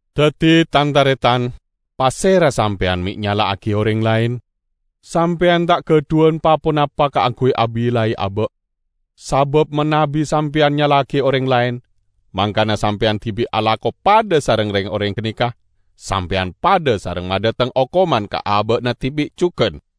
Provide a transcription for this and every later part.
Daddi, Tan-taretan, pasera sampeyan me' nyala'agiya oreng laen? Sampeyan ta' gadhuwan pa-ponapa kaangguy abillai aba'. Sabab manabi Sampeyan nyala'agi oreng laen, mangkana Sampeyan dibi' alako padha sareng reng-oreng ganeka, sampeyan padha sareng madhateng okoman ka aba'na dibi' jugan.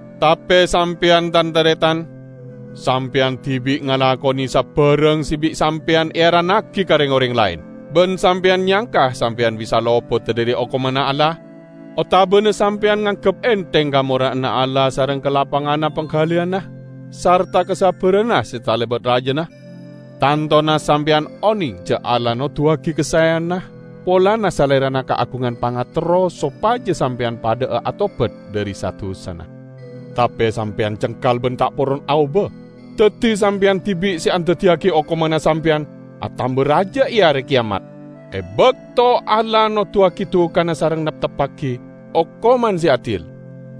Tape sampeyan, Tan-taretan, sampeyan dibi' ngalakone sabarang se bi' sampeyan earannagi ka reng-oreng laen! Ban sampeyan nyangka sampeyan bisa lopoda dhari hokomanna Allah? Otabana sampeyan nganggep entheng kamora'anna Allah sareng kalapanganna panggaliyanna sarta kasabbaranna se talebat rajana? Tantona sampeyan oneng ja' Allah noduwagi kasaeyanna polana Salerana kaagungan pangaterro sopaja sampeyan padha'a atobat dhari sa-dusana. Tape sampeyan cengkal ban ta' poron aoba. Daddi sampeyan dibi' se andaddiyagi okomanna sampeyan atamba raja e Are Keyamat, e bakto Allah noduwagi dukana sareng neptebbagi okoman se adil.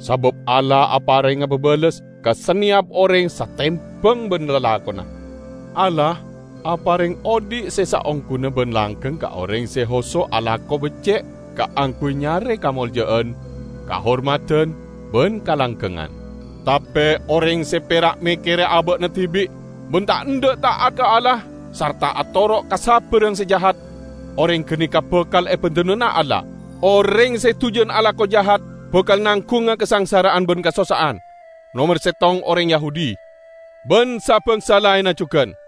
Sabab Allah aparenga babales ka saneyap oreng satembang ban lalakonna. Allah apareng odhi' se saongguna ban langgeng ka oreng se hoso' alako becce' kaangguy nyare kamolja'an, kahormadan ban kalanggengngan. Tape oreng se pera' mekkere aba'na dibi' ban ta' endha' ta'at ka Allah, sarta atoro' ka sabarang se jahat, oreng ganeka bakal ebendunana Allah. Oreng se dujan alako jahat bakal nanggunga kasangsara'an ban kasossa'an; nomer settong oreng Yahudi, ban sa-bangsa laenna jugan.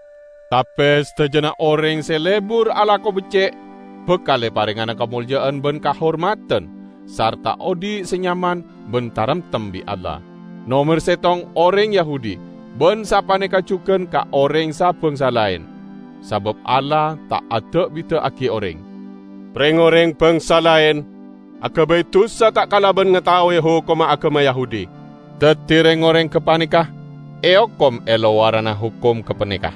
Tape sadajana oreng se lebur alako becce' bakal eparengngana kamolja'an ban kahormadan sarta odhi' se nyaman ban taremtem bi' Allah. Nomer settong oreng Yahudi ban sapaneka jugan ka oreng sa-bangsa laen. Sabab Allah ta' ada'-bida'agi oreng. Reng-oreng bangsa laen agabay dusa ta' kalaban ngataowe hokomma agama Yahudi. Daddi reng-oreng gapaneka eokom e lowaranna hokom gapaneka.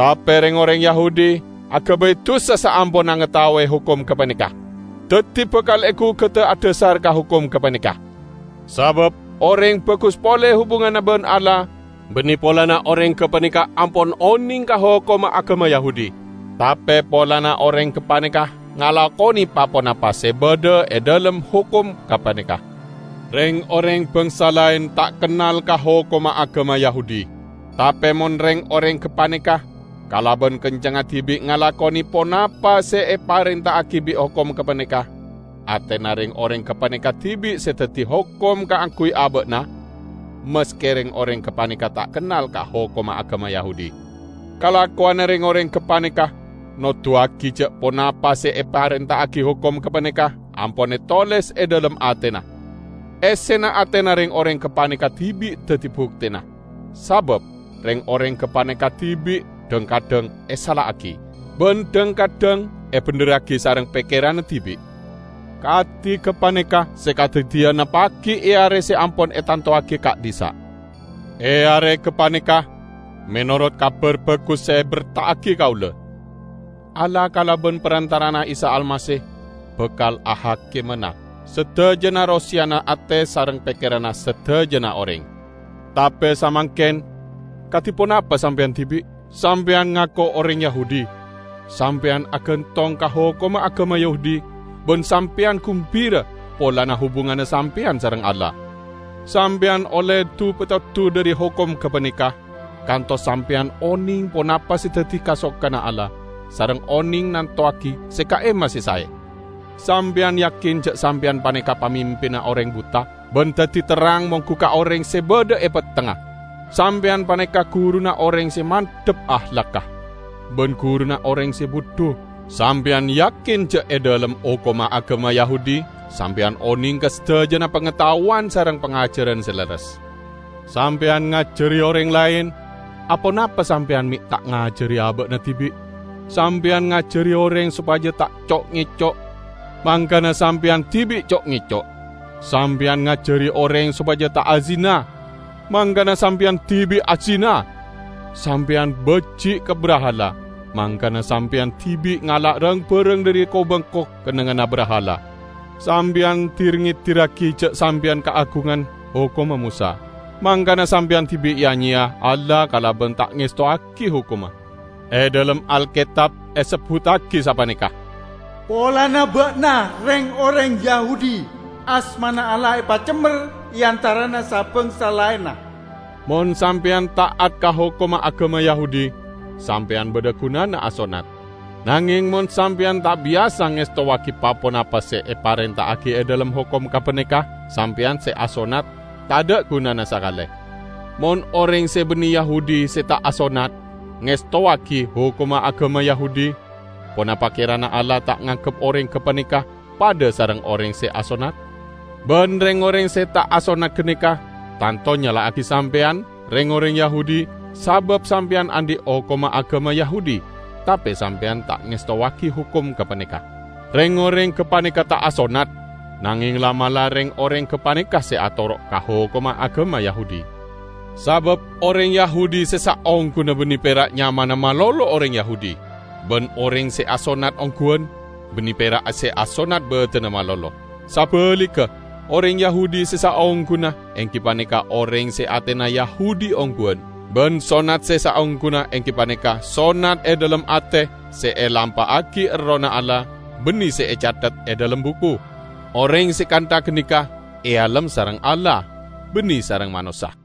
Tape reng-oreng Yahudi agabay dusa saamponna ngataowe hokom gapaneka, daddi bakal egugada adhasar ka hokom gapaneka. Sabab oreng bagus pole hubunganna ban Allah banne polana oreng gapaneka ampon oneng ka hokomma agama Yahudi, tape polana oreng gapaneka ngalakone pa-ponapa se badha e dhalem hokom gapaneka. Reng-oreng bangsa laen ta' kennal ka hokomma agama Yahudi. Tape mon reng-oreng gapaneka kalaban kencengnga dibi' ngalakone ponapa se eparenta'agi bi' hokom gapaneka, atena reng-oreng gapaneka dibi' se daddi hokom kaangguy aba'na, maske reng-oreng gapaneka ta' kennal ka hokomma agama Yahudi. Kalakowanna reng-oreng gapaneka noduwagi ja' ponapa se eparenta'agi hokom gapaneka ampon etoles e dhalem atena. Essena atena reng-oreng gapaneka dibi' daddi buktena, sabab reng-oreng gapaneka dibi' dhang-kadhang esala'agi, ban dhang-kadhang ebendherragi sareng pekkeranna dibi'. Kadi gapaneka se kadaddiyana pagi' e are se ampon etantowagi ka'dhissa'. E are gapaneka -- menorot Kabar Bagus se eberta'agi kaula -- Allah kalaban parantara'anna Isa Almasih bakal ahakimana sadajana roseyana ate sareng pekkeranna sadajana oreng. Tape samangken, kadi ponapa Sampeyan dibi'? Sampeyan ngako oreng Yahudi. Sampeyan agantong ka hokomma agama Yahudi ban Sampeyan gumbira polana hubunganna Sampeyan sareng Allah. Sampeyan olle du-petodu dhari hokom gapaneka, kantos Sampeyan oneng ponapa se daddi kasokanna Allah, sareng oneng nantowagi se ka'imma se sae. Sampeyan yakin ja' Sampeyan paneka pamimpinna oreng buta, ban daddi terrang monggu ka oreng se badha e pettengnga. Sampeyan paneka guruna oreng se mandhap ahlagga, ban guruna oreng se budhu. Sampeyan yakin ja' e dhalem hokomma agama Yahudi Sampeyan oneng ka sadajana pangataowan sareng pangajaran se lerres. Sampeyan ngajari oreng laen; aponapa Sampeyan me' ta' ngajari aba'na dibi'? Sampeyan ngajari oreng sopaja ta' co'-ngeco', mangkana Sampeyan dibi' co'-ngeco'! Sampeyan ngajari oreng sopaja ta' azina, mangkana Sampeyan dibi' azina! Sampeyan baji' ka brahala, mangkana Sampeyan dibi' ngala' rang-barang dhari ko-bengko kennengnganna brahala. Sampeyan dir-ngedirragi ja' Sampeyan kaagungan hokomma Mosa, mangkana Sampeyan dibi' ya-nyeya Allah kalaban ta' ngestowagi hokomma. E dhalem Alketab esebbuttagi sapaneka, "Polana ba'na, reng-oreng Yahudi, asmana Allah epacemmer e antarana sa-bangsa laenna." Mon Sampeyan ta'at ka hokomma agama Yahudi, Sampeyan badha gunana asonnat. Nangeng mon Sampeyan ta' biyasa ngestowagi pa-ponapa se eparenta'agi e dhalem hokom gapaneka, Sampeyan se asonnat tadha' gunana sakale. Mon oreng se banne Yahudi se ta' asonnat, ngestowagi hokomma agama Yahudi, ponapa kerana Allah ta' nganggep oreng gapaneka padha sareng oreng se asonnat? Ban reng-oreng se ta' asonnat ganeka tanto nyala'agi Sampeyan, reng-oreng Yahudi, sabab Sampeyan andhi' hokomma agama Yahudi tape Sampeyan ta' ngestowagi hokom gapaneka. Reng-oreng gapaneka ta' asonnat, nangeng la'-mala' reng-oreng gapaneka se atoro' ka hokomma agama Yahudi. Sabab oreng Yahudi se saongguna banne pera' nyamana malolo oreng Yahudi; ban oreng se asonnat ongguwan, banne pera' se asonnat badanna malolo. Sabaligga, oreng Yahudi se saongguna enggi paneka oreng se atena Yahudi ongguwan; ban sonnat se saongguna enggi paneka sonnat e dhalem ate se elampa'agi Errohna Allah, banne se ecathet e dhalem buku. Oreng se kantha ganeka ealem sareng Allah, banne sareng manossa.